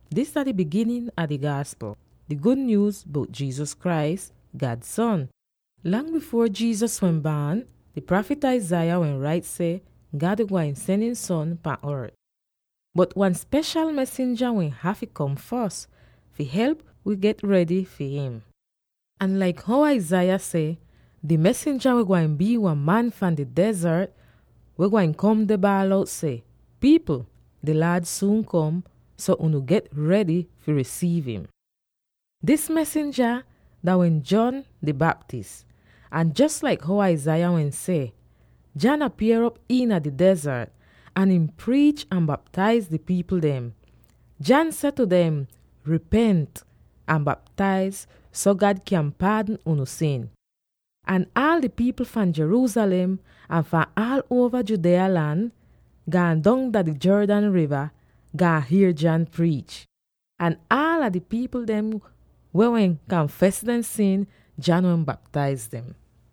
Dis dah di biginin a di Gaaspl, di gud nyuuz bout Jesus Christ, God son. Lang bifuor Jesus wehn baan, di prafit Isaiah wehn rait seh God wehn gwain sen ihn son pan ort; bot wan speshal mesinja wehn hafy kom fos, fi help wi get redy fi him. Ahn laik how Isaiah seh, di mesinja wehn gwain bii wan man fahn di dezart weh gwain kom deh baal out seh: “Pipl! Di Laad suun kom, so unu get redy fi risiiv im!” Dis mesinja dah wehn John di Baptist. Ahn jos laik how Isaiah wehn seh, John apier'op iina di dezart, ahn ihn priich ahn baptaiz di pipl dem. John seh tu dem, “Ripent ahn baptaiz so God kyan paadn unu sin.” Ahn aal di pipl fahn Jerusalem ahn fahn aal uova Judea lan gaan dong dah di Jordan riva, gaan hier John priich. Ahn aala di pipl dem weh wehn kanfes dehn sin, John wehn baptaiz dem.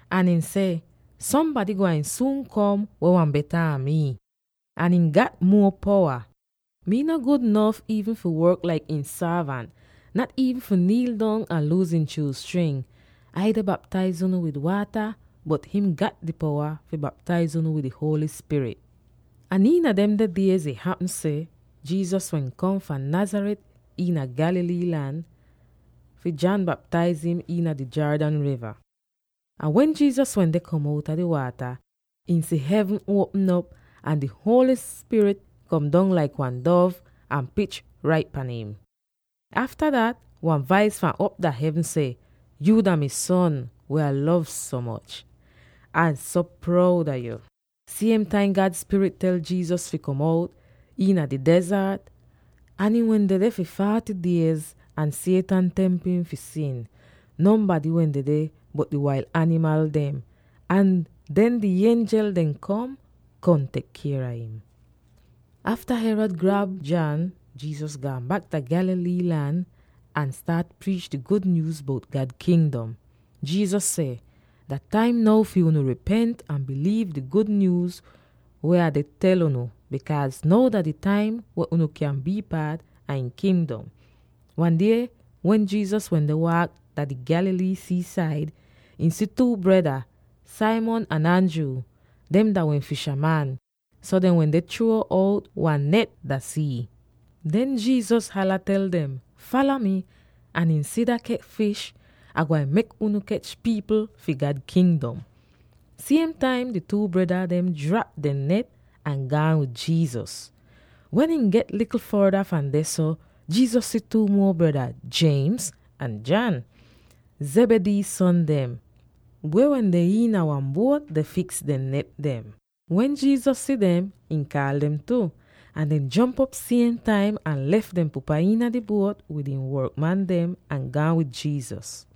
Ahn ihn seh, “Sombady gwain suun kom weh beta an mii, ahn ihn gat muo powa. Mii no gud nof iivn fi work laik ihn sorvant, nat iivn fi niil dong ahn luus ihn shuuz string. Ai deh baptaiz unu wid waata, bot him gat di powa fi baptaiz unu wid di Holy Spirit.” Ahn iina demde diez ih hapm seh Jesus wehn kom fahn Nazareth iina Galilee lan fi John baptaiz im iina di Jordan riva. Ahn wen Jesus wende kom op outa di waata, ihn si hevn uopm op, ahn di Holy Spirit kom dong laik wan dov, ahn pich rait pan im. Afta dat wan vais fahn op dah hevn seh, “Yuu dah mi Son weh Ah lov so moch; Ah so proud a yo.” Siem taim God Spirit tel Jesus fi go out iina di dezart. Ahn ihn wehn dedeh fi forty diez, ahn Satan temp im fi sin. Nonbady wehn dedeh, bot di wail animal dem. Ahn den di ienjel dem kom, kom tek kier a im. Afta Herod grab John, Jesus gaan bak dah Galilee lan ahn staat priich di gud nyuuz bout God Kingdom. Jesus seh, “Dah taim now fi unu ripent ahn biliiv di gud nyuuz weh Ah deh tel unu, bikaaz now dah di taim wen unu kyan bii paat a ihn Kingdom!” Wan die wen Jesus wende waak dah di Galilee sii-said, ihn si two breda, Simon ahn Andrew. Dem dah wehn fishaman, so dehn wende chruo out wan net dah sii. Den Jesus hala tel dem, “Fala mi, ahn insida kech fish, Ah gwain mek unu kech pipl fi God Kingdom.” Siem taim, di two breda dehn drap dehn net ahn gaan wid Jesus. Wen ihn get likl forda fahn dehso, Jesus si two muo breda, James ahn John, Zebedee son dem, weh wende iina wan buot deh fiks dehn net dem. Wen Jesus si dem, ihn kaal dem tu, ahn dehn jomp op siem taim ahn lef dehn pupa iina di buot wid ihn workman dem ahn gaan wid Jesus.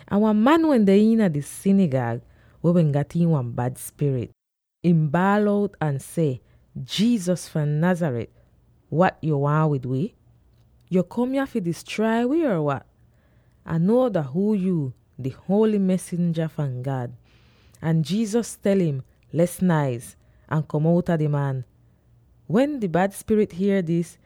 Ahn wan man wende iina dehn sinigag, weh wehn gat iin wan bad spirit. Ihn baal out ahn seh, “Jesus fahn Nazareth, wat yo waahn wid wi? Yo kom yah fi distrai wi or wat? Ah nuo dah huu yu: di Holy Mesinja fahn God!” Ahn Jesus tel im, “Les naiz, ahn kom outa di man!” Wen di bad spirit hier dis,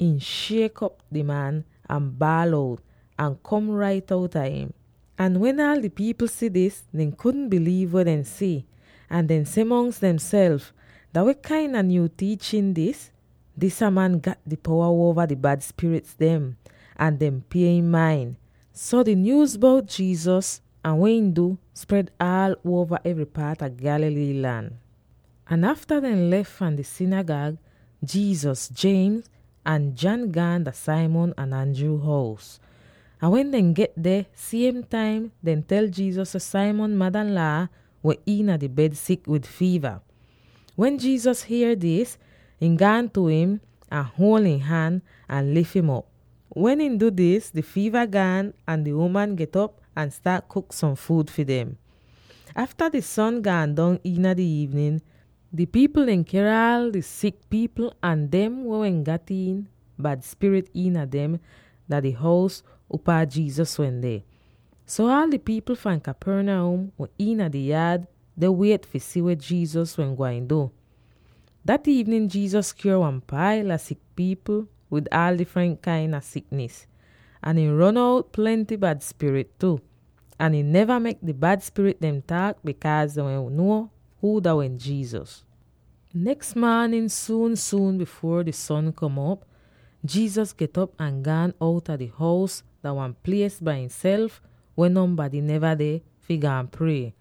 ihn shiek op di man, ahn baal out, ahn kom rait outa im. Ahn wen aal di pipl si dis, dehn kudn biliiv weh dehn si, ahn dehn seh mongs demself, “Dah weh kain a nyuu tiichin dis? Disa man gat di powa uova di bad spirit dem, ahn dehn pie im main!” So di nyuuz bout Jesus, ahn weh ihn du, spred aal uova evry paat a Galilee lan. Ahn afta dehn lef fahn di sinigag, Jesus, James, ahn John gaan dah Simon ahn Andrew hous. Ahn wen dehn get deh, siem taim dehn tel Jesus seh Simon madanlaa wehn iina di bed sik wid fiiva. Wen Jesus hier dis, ihn gaan tu im, ahn huol ihn han, ahn lif'im op. Wen ihn du dis, di fiiva gaan, ahn di uman get'op ahn staat kuk som fuud fi dem! Afta di son gaan dong iina di iivnin, di pipl dem ker aal di sik pipl ahn dem weh wehn gat iin bad spirit iina dem dah di hous upaa Jesus wehn deh. So aal di pipl fahn Capernaum wende iina di yaad deh wiet fi si weh Jesus wehn gwain du. Dah iivnin Jesus kyuor wan paila sik pipl wid aal difrent kain a siknis, ahn ihn ron out plenty bad spirit tu, ahn ihn neva mek di bad spirit dem taak, bikaaz dehn wehn nuo huu dah wehn Jesus. Neks maanin suun-suun bifuor di son kom op, Jesus get'op ahn gaan outa di hous dah wan plies bai ihnself weh nonbady neva deh, fi gaan prie.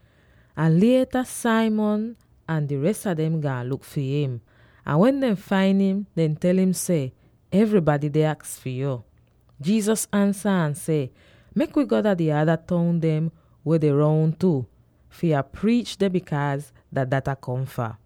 Ahn lieta Simon ahn di res a dem gaan luk fi im. Ahn wen dehn fain im, dehn tel im seh, “Evrybady deh aks fi yo.” Jesus ansa ahn seh, “Mek wi go dah di ada toun dem weh deh roun tu, fi Ah priich deh, bikaaz dah dat Ah kom fah.”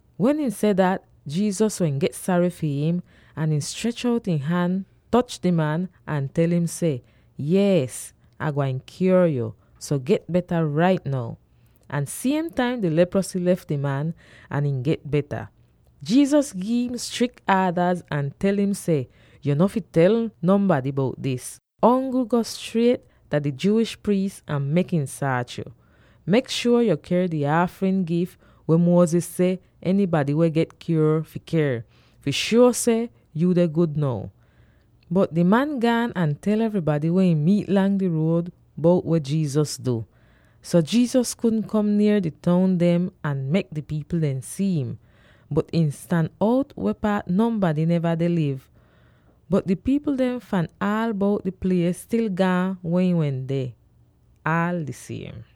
Wen ihn seh dat, Jesus wehn get sary fi im, ahn ihn strech out ihn han, toch di man, ahn tel im seh, “Yees, Ah waahn kyuor yo, so get beta rait now!” Ahn siem taim di leprosy lef di man ahn ihn get beta! Jesus gi'im strik aadaz ahn tel im seh, “Yo no fi tel nonbady bout dis; ongl go striet dah di Jewish priis ahn mek im saach yo. Mek shuor yo ker di aafrin gif weh Moses seh enybady weh get kyuor fi ker, fi shuo seh yu deh gud now.” Bot di man gaan ahn tel evrybady weh ihn miit lang di ruod bout weh Jesus du! So, Jesus kudn kom nier di toun dem ahn mek di pipl dem si'im, bot ihn stan out weh paat nonbady neva deh liv. Bot di pipl dem fahn aal bout di plies stil gaan weh ihn wende, aal di siem.